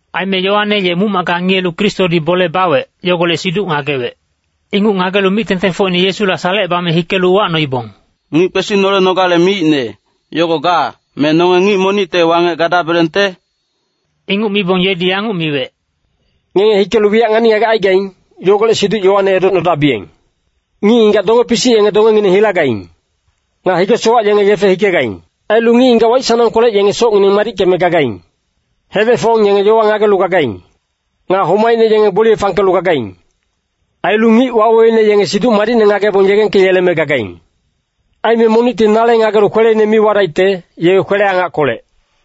Aime Yoane ye muc-macka ngiyelu Kristodi bole bawec, yogolec siduc ngagewec. Inguc ngagelu mic-tengtengfocine Yesula salecebame hikelu uwacnoibong, “Ngic kwesinolenogale miicne, yogo ga, me nonge ngic monicte wangec gadabelengte?” Inguc mibong yedi yanguc miwec, “Ngenge hikelu wiyac ngani-ngagec aigaing, yogolec siduc Yoane edocnodabiyeng! Ngic-ngigac donge-pisic yenge dongengineng hilagaing. Nga hige-sowac yenge yefe hikegaing. Ailu ngic-ngigac waic-sanangkolec yenge socngineng madickeme gagaing. Hedec-fong yenge yowa ngagelu gagaing. Nga homaicne yenge gboliye fangkelu gagaing. Ailu ngic waweweine yenge Siduc Madicne ngagebong yegengkeyeleme gagaing. Aime monicti nale ngagelu kweleine mi wadaicte, ye kwele-angackolec.”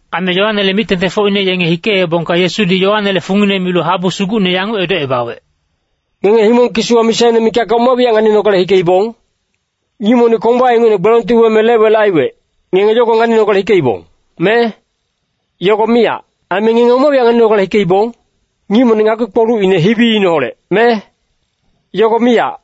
Aime Yoanele mic-tengtengfocine yenge hikeebongka Yesudi Yoanele fungine milu habu sugucne yanguc edocebawec, “Ngenge himong kisiwa misaine mikacka oma wiyac nganinogale hikeibong? Ngic monic komba ingucne gbelongti weme lec-welec aiwec, ngenge yogo nganinogale hikeibong, me? Yogo miyac. Aime ngenge oma wiyac nganinogale hikeibong? Ngic monic ngakpi-kpolucine hibiineholec, me? Yogo miyac.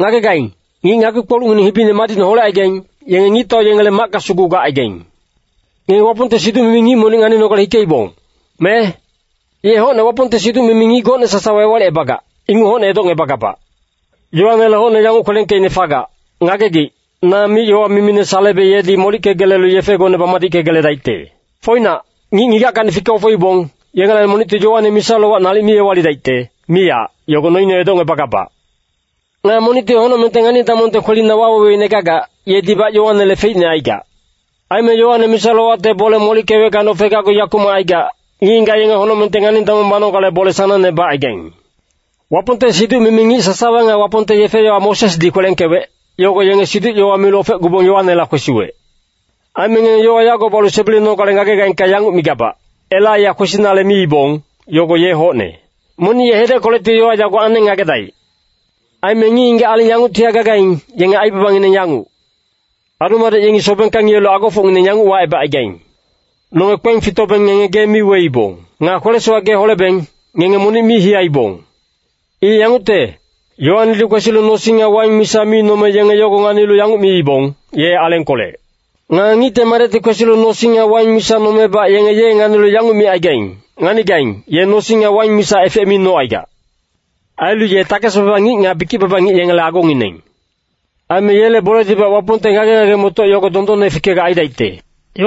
Ngagegaing, ngic ngakpi-kpolucngineng hibine madicne holecaigaing, yenge ngictau yengele macka sugu gacaigaing. Ngenge Wapongte siduc-mimi ngic monic nganinogale hikeibong, me? Ye hocne Wapongte siduc-mimi ngic gocne sasawa ewalicebagac, inguc hocne edocngebagabac. Yoanele hocne yanguc kwelengkeicne fagac, ‘Ngagegic, na mic-yowa mimine salebe yedi molickegelelu yefegone bamadickegeledaicte.’ Foinac, ngic-ngigackacni fike-ofeibong, yengelacni monicti Yoane misa-lowac nalic mi ewalidaicte, miyac, yogo noine edocngebagabac. Nga monicti honocmengte ngani-damongte kwelina waweweine gagac, yedibac Yoanele feicne aigac. Aime Yoane misa-lowacte bole molickeweckacni ofegacgu yakumac aigac, ngic-ngigac yenge honocmengte ngani-damong banogale bole sanangne bacaigaing. Wapongte siduc-mimi ngic sasawa nga Wapongte yefe-yowa Mosesdi kwelengkewec, yogo yenge siduc-yowa milu ofecgubong Yoanela kwesiwec. Aime ngenge yowa yago balu sebilenogale ngagegaingka yanguc migabac, Elaiya kwesinale miibong, yogo ye hocne. Monic ye hedeckolecti yowa yago aneng ngagedaic. “Aime ngic-ngigac aling yanguctihac gagaing, yenge aibabangineng yanguc. Adu-madec yengi sobengka ngiyelu agofocngineng yanguc wacebacaigaing, ‘Nonge kpeng fitobeng ngenge gee mi weibong. Nga kwele-sowac gee holebeng, ngenge monic mi hiyaibong.’ I yangucte, Yoanedi kwesilu nosing nga waing misa mi nome yenge yogo nganilu yanguc miibong, ‘Ye alengkolec.’ Nga Ngicte Madecti kwesilu nosing nga waing misa nomebac yenge ye nganilu yanguc micaigaing, ‘Nganigaing, ye nosing nga waing misa efec mi nocaigac. Ailu ye takes-baba ngic nga bikic-baba ngic yengele agongineng.’ Aime yele boledibac Wapongte ngage-ngage-motoc yogo dondonne fikegac aidaicte.”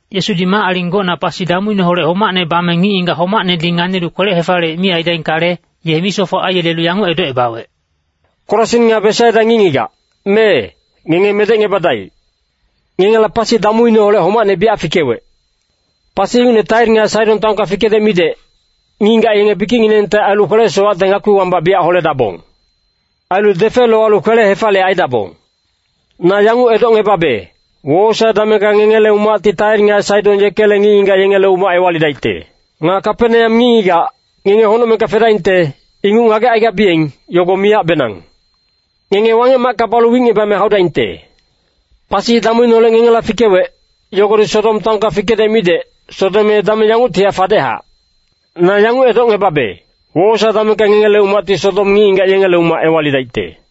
Yesudi mac-aling gocna pasi damuineholec homacne bame ngic-ngigac homacnedi nganilu kwele-hefaliyec mi aidaingkale, ye misofoc aiyelelu yanguc edocebawec, “Korasin nga Besaida ngic-ngigac, mee, ngenge medecngebadaic. Ngengela pasi damuineholec homacne biyac fikewec. Pasi ingucne Tair nga Saidon taonka fikedec midec, ngic-ngigac yenge bikicnginengte ailu kwele-sowacte ngakpi wambac biyac holedabong. Ailu defe lowalu kwele-hefaliyec aidabong. Na yanguc edocngebabe, wowosae damengka ngengele umacti Tair nga Saidon yekele ngic-ngigac yengele umac ewalidaicte. Nga Kapeneam ngic-ngigac, ngenge honocmengka fedaingte, inguc ngagecaigabiyeng, yogo miyacbenang. Ngenge Wangec-macka balu wicngebame haudaingte. Pasi damuineholec ngengela fikewec, yogodi Sodom taonka fikedec midec, Sodom ye dameng yanguctihac fadechac. Na yanguc edocngebabe, wowosae damengka ngengele umacti Sodom ngic-ngigac yengele umac ewalidaicte.”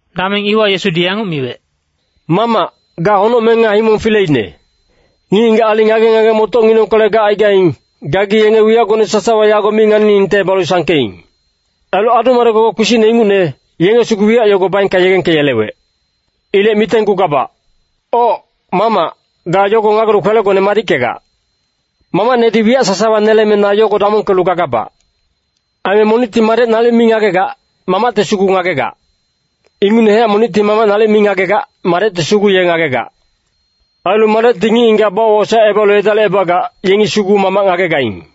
Dameng iwa Yesudi yanguc miwec, “Mamac, ga honocmeng nga himong fileine. Ngic-ngigac aling ngage-ngage-motocnginengkolec gacaigaing, gagi yenge wiyacgone sasawa yago mi nganiningte balu sangkeing. Ailu adu-madec-gogoc kpisicne ingucne, yenge sugu wiyac yogo baengka yegengkeyelewec. Ilec mitenggugabac. Oc, Mamac, ga yogo ngagelu kwelegone madickegac. Mamacnedi wiyac sasawa neleme na yogo damongkelu gagabac. Aime monicti Madec nalic mi ngagegac, Mamacti sugu ngagegac. Ingucnehac monicti Mamac nalic mi ngagegac, Madecti sugu ye ngagegac. Ailu Madecti ngic-ngigac bawosaecebalu edalicebagac, yengi sugu Mamac ngagegaing.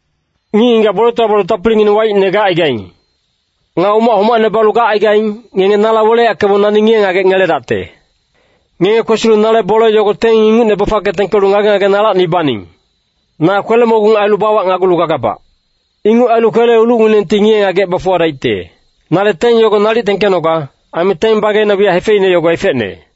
“Ngic-ngigac boletowa balu tapilingineng waicne gacaigaing. Nga umac homacne balu gacaigaing, ngenge nala weleyackebong nani ngiye-ngagec ngeledacte. Ngenge kwesilu nale bole yogo teng ingucne bafangke tengkelu ngage-ngage nalacni baning. Na kwele-mogung ailu bawacnagulu gagabac. Inguc ailu kwele-ilucnginengti ngiye-ngagec bafuwadaicte. Nale teng yogo nalic tengkenoga, aime teng bageina wiyac hefeicne yogo efecne.”